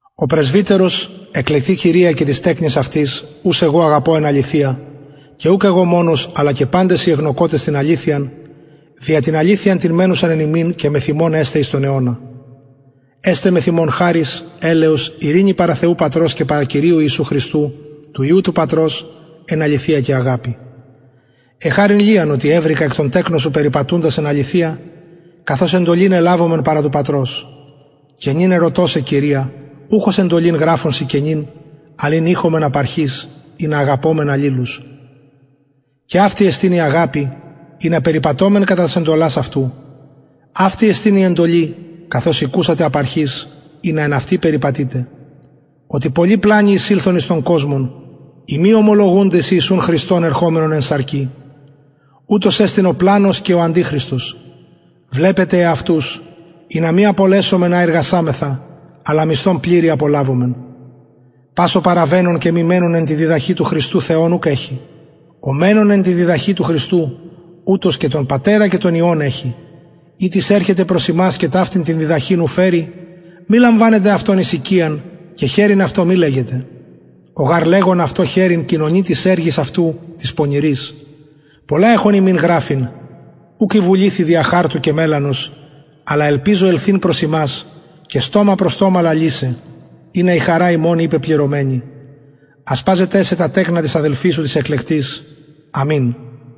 ο πρεσβυτερος εκλεκτη κυρια και τοις τεκνοις αυτης ους εγω αγαπω εν αληθεια και ουκ εγω μονος αλλα και παντες οι εγνωκοτες την αληθειαν δια την αληθειαν την μενουσαν εν ημιν και μεθ ημων εσται εις τον αιωνα εσται μεθ ημων χαρις ελεος ειρηνη παρα θεου πατρος και παρα κυριου ιησου χριστου του υιου του πατρος εν αληθεια και αγαπη εχαρην λιαν οτι ευρηκα εκ των τεκνων σου περιπατουντας εν αληθεια καθως εντολην ελαβομεν παρα του πατρος και νυν ερωτω σε κυρια ουχ ως εντολην γραφων σοι καινην αλλα ην ειχομεν απ αρχης ινα αγαπωμεν αλληλους και αυτη εστιν η αγαπη ινα περιπατωμεν κατα τας εντολας αυτου αυτη εστιν η εντολη καθως ηκουσατε απ αρχης ινα εν αυτη περιπατητε οτι πολλοι πλανοι εισηλθον εις τον κοσμον οι μη ομολογουντες ιησουν χριστον ερχομενον εν σαρκι ουτος εστιν ο πλανος και ο αντιχριστος βλεπετε εαυτους ινα μη απολεσωμεν α ειργασαμεθα αλλα μισθον πληρη απολαβωμεν πας ο παραβαινων και μη μενων εν τη διδαχη του χριστου θεον ουκ εχει ο μενων εν τη διδαχη του χριστου ουτος και τον πατερα και τον υιον εχει ει τις ερχεται προς υμας και ταυτην την διδαχην ου φερει μη λαμβανετε αυτον εις οικιαν και χαιρειν αυτω μη λεγετε ο γαρ λεγων αυτω χαιρειν κοινωνει τοις εργοις αυτου τοις πονηροις πολλα εχων υμιν γραφειν ουκ εβουληθην δια χαρτου και μελανος αλλα ελπιζω ελθειν προς υμας και στομα προς στομα λαλησαι ινα η χαρα ημων η πεπληρωμενη ασπαζεται σε τα τεκνα της αδελφης σου της εκλεκτης αμην